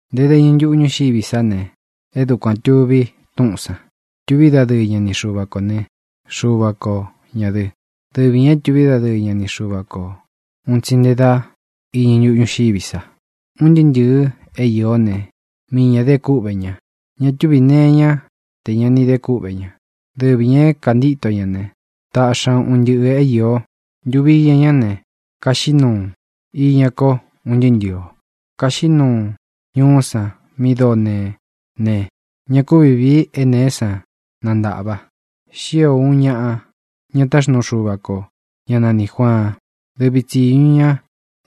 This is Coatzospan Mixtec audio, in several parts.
Nte dá iñɨ ntuꞌu ñúxiví sa ne, e dúkuan tuvi Túꞌūn san. Tuví dadɨɨ ña ni Xuva kō né, Xuva ko ñā dɨ. Dɨvi ñā é tuví dadɨɨ ña ni Xuva ko ūun tsi nte dá iñɨ ntuꞌu ñúxiví sa. Un ntɨɨ́ ntɨ̄ɨ é īó ne, mii ñā de kúꞌvē ña. Ña túvī nee iñá te ña ni de kúꞌvē ña. Dɨvi ñā é kantito ña ne, tāꞌxi ña un ntɨꞌɨ̄ é īo. Ntuvi iña ñá ne, kaxiꞌí nuu iña ko un ntɨɨ́ ntɨ̄ɨ o. Kaxiꞌí nuu ñuꞌú san mi dóo neé ne, ña kúvi vīi é nēé san nántaꞌva. Xío uun ñāꞌa, ña táxnuu Xuva kō, ñá nanī Juaan. Dɨvi tsīñu ña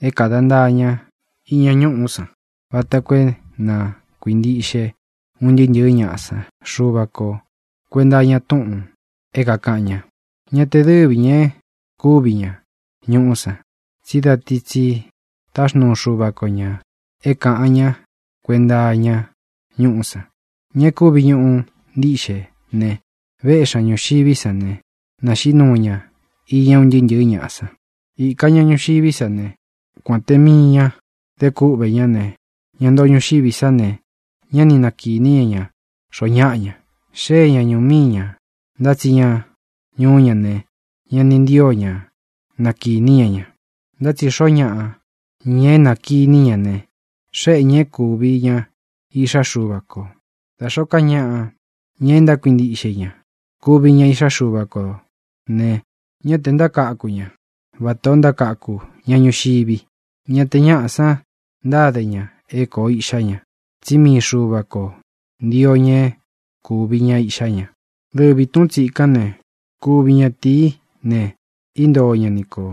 é kāda ntaa ña iña ñuꞌú san, vata koo é na kuīntiꞌxe un ntɨɨ́ ntɨ̄ɨ́ ñaꞌa san Xuva ko kuēnta iña túꞌūn é kākaꞌan ña. Ñá tē dɨ́vi ñā e kúvi ñā ñuꞌú san, tsí da ti tsi táxnuu Xuva ko ñā é kāꞌan ñá kuenta iña ñúꞌú san. Ña e kúvi ñuꞌu ntiꞌxe ne, véꞌxi ña ñūxiví san ne, nāxiꞌí nuu ña iña un ntɨɨ́ ntɨ̄ɨ́ ñaꞌa san. Īka ña ñuxiví sa ne, kuān te mii ña de kúꞌvē ñá ne, ña ntoo ñuxiví sa ne, ñá ni nakīní ña ña xoo ñáꞌa ña. Xée ña ñūú mii ñā, ntá tsi ña ñuú ña ne, ña ni ntío ña nakīní ña ña. Ntá tsi xoo ñáꞌa, ña é nakīní ña ne, xéꞌe ñā é kūvi ña iꞌxá Xuva kō, da xōó ka ñaꞌa, ña e ntákuintiꞌxe i ña. Kuvi ña iꞌxá Xuva kō ne, ñá tē ntákaku ña vata ō ntákaku ñaꞌa ñuxivi; ñá te ñāꞌa san ntáde ña é kōo iꞌxá ña, tsí mii Xuva kō ntío ña é kūvi ña iꞌxá ña. Dɨvi Tūꞌún tsikán ne, kuvi ñatīí ne, íntoo ña ni kō.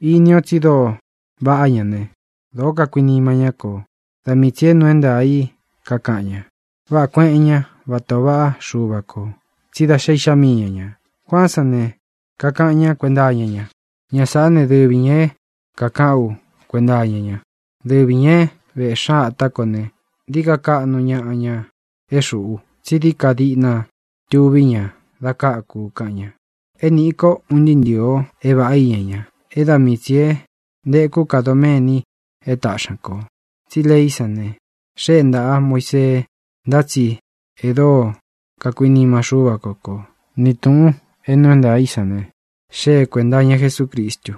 Iní o tsi dóo vaꞌá ña ne, dōo kakuinima ñá kō. Da mii tsī é nuu é ntaā í kakaꞌan ña. Váꞌā kueꞌen ñá vata ō vaꞌá Xuva kō, tsí da xé Iꞌxá mii ña ñā. Juaan sán ne, kakaꞌan ñá kuenta iña ña: —Ña sāꞌá ne, dɨvi ñā é kākaꞌán u kuenta iña ña. Dɨvi ñā é véꞌxi ña ata kō ne, dií ka kaꞌnu ñaꞌa ña é xuꞌu, tsí dií ka diꞌna tuví ña da káku u —kaꞌan ña. É nīꞌi ko, un ntɨɨ́ ntɨ̄ɨ o, é vāꞌá iña ña, e dá mii tsī é ntēkú ka doméni e táꞌxi ña kō. Tsí leí san ne, xée ntāꞌa Muísee, ntá tsi e dóo kakuinima Xúva ko ko, ni tūꞌun é nuu é ntaā í san ne, xée kuēnta iña Jesúcristu.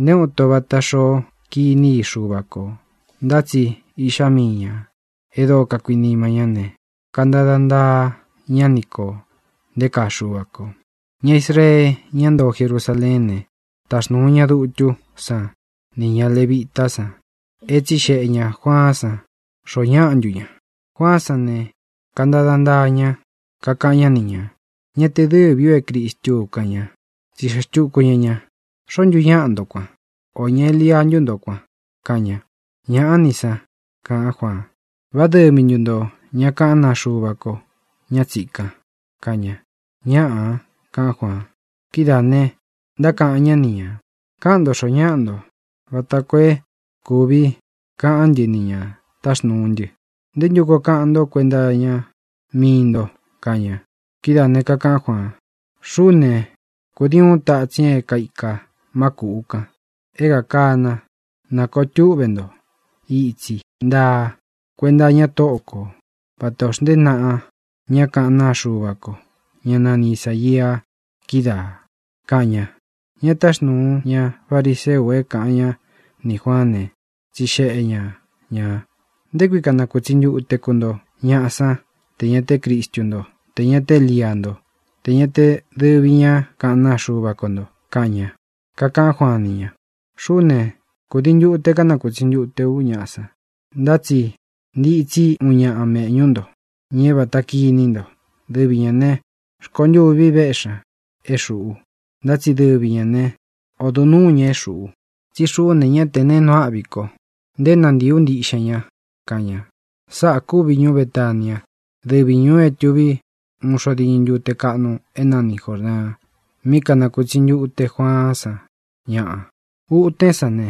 Nté uun ito vata xoó kiní i Xuva kō. Ntá tsi Iꞌxá mii ñā e dóo kakuinima ñá ne, kantada ntaa ñá ni kō nté kaa Xuva kō. Ña Israee, ñá ntoo Jerusaleén ne, taxnūu ña dutú san nī ña levitá san é tsixeꞌe ñā Juaán san xoo ñáꞌa ntu ña. Juaán san ne, kantada ntaa ñá, kakaꞌan ñá ni ñā: —Ña te dɨ́vi u é Cristú u —kaꞌan ña. Tsixeꞌe xtuku ña ñā: —¿Xoó ntu ñaꞌa nto kuan? ¿Ō ña Elia ntú nto, kuān? —kaꞌan ña. —Ñāꞌá ni san —kaꞌán Juaan. —¿Vá dɨvi ntu ntō ña kaꞌán naa Xuva ko, ña tsíkan? —kaꞌan ña. —Ñáꞌā —kaꞌan Juaan. Kidáā ne, ntákaꞌan ñá ni ñā: —Káꞌan nto xoo ñáꞌa nto vata koo é kūvi kaꞌan ntɨ́ nī ña táxnūu ntɨ. ¿Nté ntu koo kaꞌan nto kuenta iña mii nto? —kaꞌan ña. Kidáā ne, kakaꞌán Juaan: —Xuꞌú ne, kūdii uun tatsin é kaika má kūꞌu kan, é kakana: “Na kōo túꞌve ntó itsi ntaa kuénta iña Tóꞌo kō”, vata ō xntée naꞌa ñá kaꞌán naa Xuva ko, ñá nani Isāia, kídaā —kaꞌan ña. Ña táxnūu ña fariseu é kāꞌan ñá nī Juaán ne, tsixeꞌe ña ñā: —¿Nté kui kanakūtsi ntute ku nto ñaꞌa sán tē ña te Crístu nto, tē ña te Élia nto, tē ña te dɨvi ña kaꞌán naa Xuva ko ntō? —kaꞌan ña. Kakaꞌán Juaan ni ña: —Xuꞌú ne, kūdii ntute kánakūtsi ntute ú ñaꞌa san. Ntá tsi ntitsí uun ñaꞌa méꞌñu ntō, ña é vāta kíni nto. Dɨvi ñā ne, rkontûvi véꞌxi ña é xūꞌu, ntá tsi dɨvi ñā né, odo nuū ña é xuꞌu. Tsí xuꞌú ne, ñá tē neé nuu áꞌvi ko, nté nantīi ú ntiꞌxen ña —kaꞌan ña. Sáꞌā kúvi ñuú Betania, dɨvi ñūu é tuví uun xo diñɨ ntute kaꞌnu é nani Jōrdaan, mí kanakūtsi ntute Juaán san ñaꞌa. Utén san ne,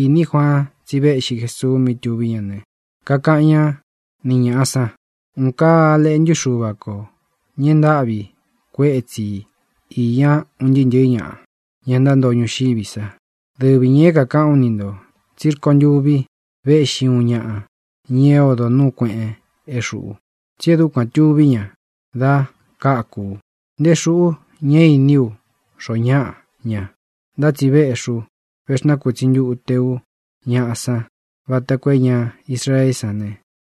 īní Juaan tsí véꞌxi Jesuu mí tuví ña ne, kakaꞌan ñá ni ñāꞌa san: —¡Un kaa Á Leꞌntu Xúva kō, ña e ntáꞌvi kuétsi i īña un ntɨɨ́ ntɨ̄ɨ́ ñaꞌa, ña ntántoo ñuxiví sa! Dɨvi ñā é kākaꞌán u ni ntō tsí rkontûvi véꞌxi uun ñaꞌa, ña é odo nūu kueꞌen é xuꞌu, tsí e dúkuān tuví ña da káku u. Nté xuꞌu ñá īní u xoo ñáꞌa ña, ntá tsi véꞌxī u, véxnakutsi ntūte ú ñaꞌa san vata koo é ña Israeé san ne,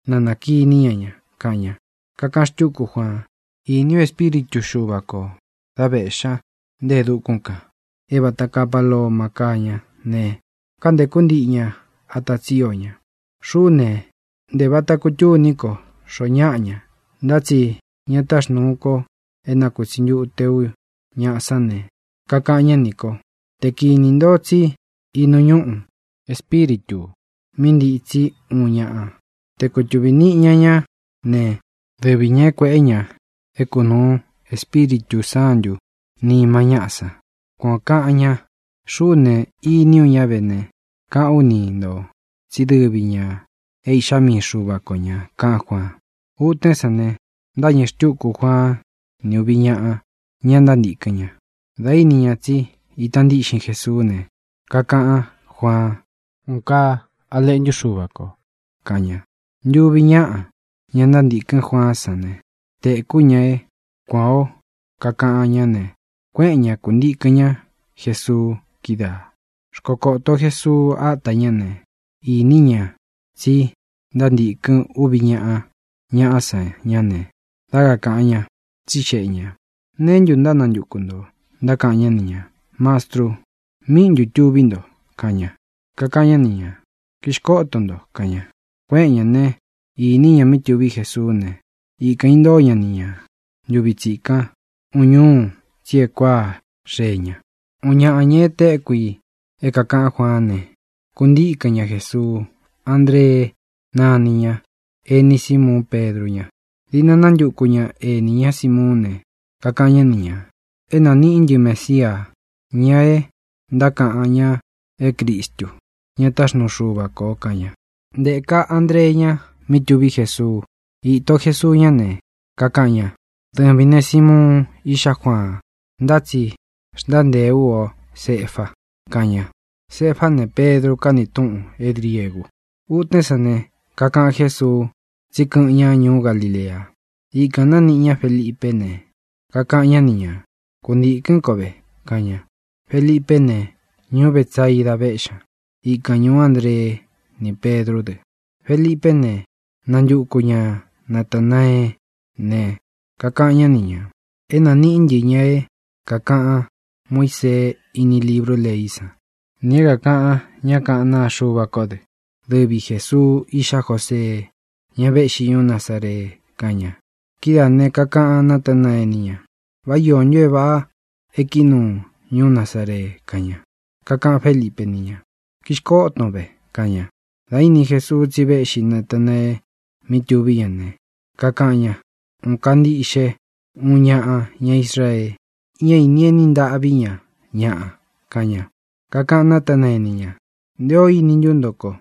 na nā kiní ña ña —kaꞌan ña. Kakaꞌan xtúku Juaan: —Īní u Espíritu Xuva kō dá vēꞌxí ña nte e dukún kān é vāta kaa paloma káa ña ne, kántēkú ntiꞌi ña ata tsío ña. Xuꞌú ne, ntē vata kutúni ko xoo ñáꞌa ña, ntá tsi ña táxnūu ko é nakūtsi ntute ú ñaꞌa sán ne, kakaꞌan ñá nī ko: “Te kīní nto tsí inu ñúꞌu Espíritū mí ntitsi úun ñaꞌa, te kutuvī niꞌi ña ñá ne, dɨvi ñā é kuēꞌé ña é kūnuu Espíritū Sántū nima ñáꞌa san.” Kuan ō kaꞌan ña. Xuꞌú ne, īní u ña ve ne, kaꞌán u ni ntō tsí dɨvi ñā é Iꞌxá mii Xuva ko ñā —kaꞌán Juaan. Utén san ne, ntâñɨ xtúku Juaan ni uvi ñáꞌa, ña ntántīkɨn ña. Dā íni ña tsi ita ntíꞌxin Jesuú ne, kakaꞌán Juaan: —¡Un kaa Á Leꞌntu Xúva kō! —kaꞌan ña. Ntúvi ñaꞌa, ña ntántīkɨ́n Juaán san ne, tēkú ña é kuān ó kakaꞌan ñá ne, kuéꞌen ña, kūntíkɨn ña Jēsuu kídaā. Xkokoto Jesuu áta ña ne, īní ña tsi ntántīkɨn úvi ñāꞌa ñaꞌá san ñá ne, dá kakāꞌan ñá, tsixeꞌe ñā: —¿Neé ntu ntánantuku ntō? Ntákaꞌan ñá ni ñā: —Mastru, ¿míꞌi ntū tuví nto? —kaꞌan ña. Kakaꞌan ñá ni ñā: —Kixkóto nto —kaꞌan ña. Kuéꞌen ñā né, īní ña mí tuví Jesuú ne, ikān intóo ña ni ña ntūvi tsikan ūun ñúu, tsí e kuáa xee ña. Uun ñaꞌa, ña e téku i é kākaꞌán Juaán ne, kuntíkɨn ña Jesuu. Andree náni ña. Ení Simuun Pedru ña. Diꞌna nántuku ña ēní ña Simuún ne, kakaꞌan ñá ni ñā: —É nāniꞌí ntɨ Mesia, ña e ntákaꞌan ña é Cristu, ña táxnuu Xuva kō —kaꞌan ña. Ntēka Andreé ña mí tuví Jesuu. Īto Jesuu ñá ne, kakaꞌan ña: —Dɨvīn né, Simuun, iꞌxá Juaan. Ntá tsi xntántēe ú o Cefa —kaꞌan ña. (Cefá ne, Pedru káni túꞌun é griegu.) Utén san ne, kakaꞌan Jésuu tsí kɨꞌɨn ña ñuú Galilea. Ikān nániꞌi ñá Felipé ne, kakaꞌan ñá ni ñā: —Kuntīkɨ́n ko ve —kaꞌan ña. Felipé ne, ñuú Betsaida véꞌxi ña, ikan ñūú Andree ni Pedrú dɨ. Felipé ne, nántuku ña Natānaeé ne, kakaꞌan ñá ni ñā: —É nāniꞌí ntɨ ña é kākaꞌan Muísee íni librú leí san, nī é kākaꞌan ñá kaꞌán naa Xuva kó dɨ. Dɨvi Jēsuu, iꞌxá Josee, ña véꞌxi ñuú Nazaree —kaꞌan ña. Kidáā ne, kakaꞌan Natánaee ni ña: —¿Vá iō ntu é vāꞌa e kií nuu ñuú Nazaree? —kaꞌan ña. Kakaꞌan Félipe ni ña: —Kīxkóton ve —kaꞌan ña. Dā íni Jesuu tsi véꞌxi Natanaee mí tuví ña ne, kakaꞌan ña: —Un kaa ntíꞌxe uun ñaꞌa ña Israee. Ñá īni eni ntaꞌví ña ñaꞌa —kaꞌan ña. Kakaꞌan Nátanaee ni ña: —¿Nté ō íni ntu nto ko?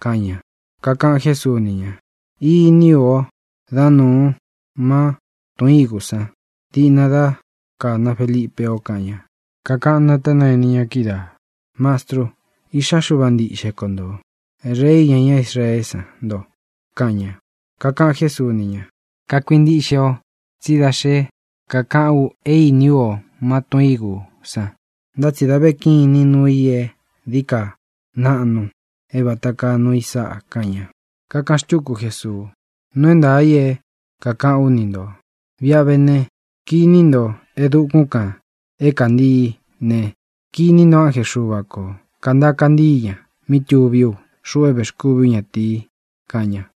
—kaꞌan ña. Kakaꞌan Jésuu ni ña: —Īní u o dá nuun má tun ígu san diꞌna dá kāna Felipe o —kaꞌan ña. Kakaꞌan Nátanaee ni ña kídaā: —Mastru, Iꞌxá Xuva ntiꞌxe ko ntō. Rei iña ñá Israeé san nto —kaꞌan ña. Kakaꞌan Jésuu ni ña: —¿Kakuintiꞌxe o tsí da xé kakaꞌán u é īní u o má tun ígu san? Ntá tsi da ve kinín nuu i é dií ka naꞌnu é vāta kaa nuu i sáꞌa —kaꞌan ña. Kakaꞌan xtúku Jesuu: —Nuu é ntaā i é kākaꞌán u ni ntō: Viꞌi a vé ne, kiní nto e dukún kān é kantii ne, kiní nto ánje Xuva kō kantaa kantíi ña mí tuví u, xuꞌu é vēxkúvi ú ñatīi —kaꞌan ña.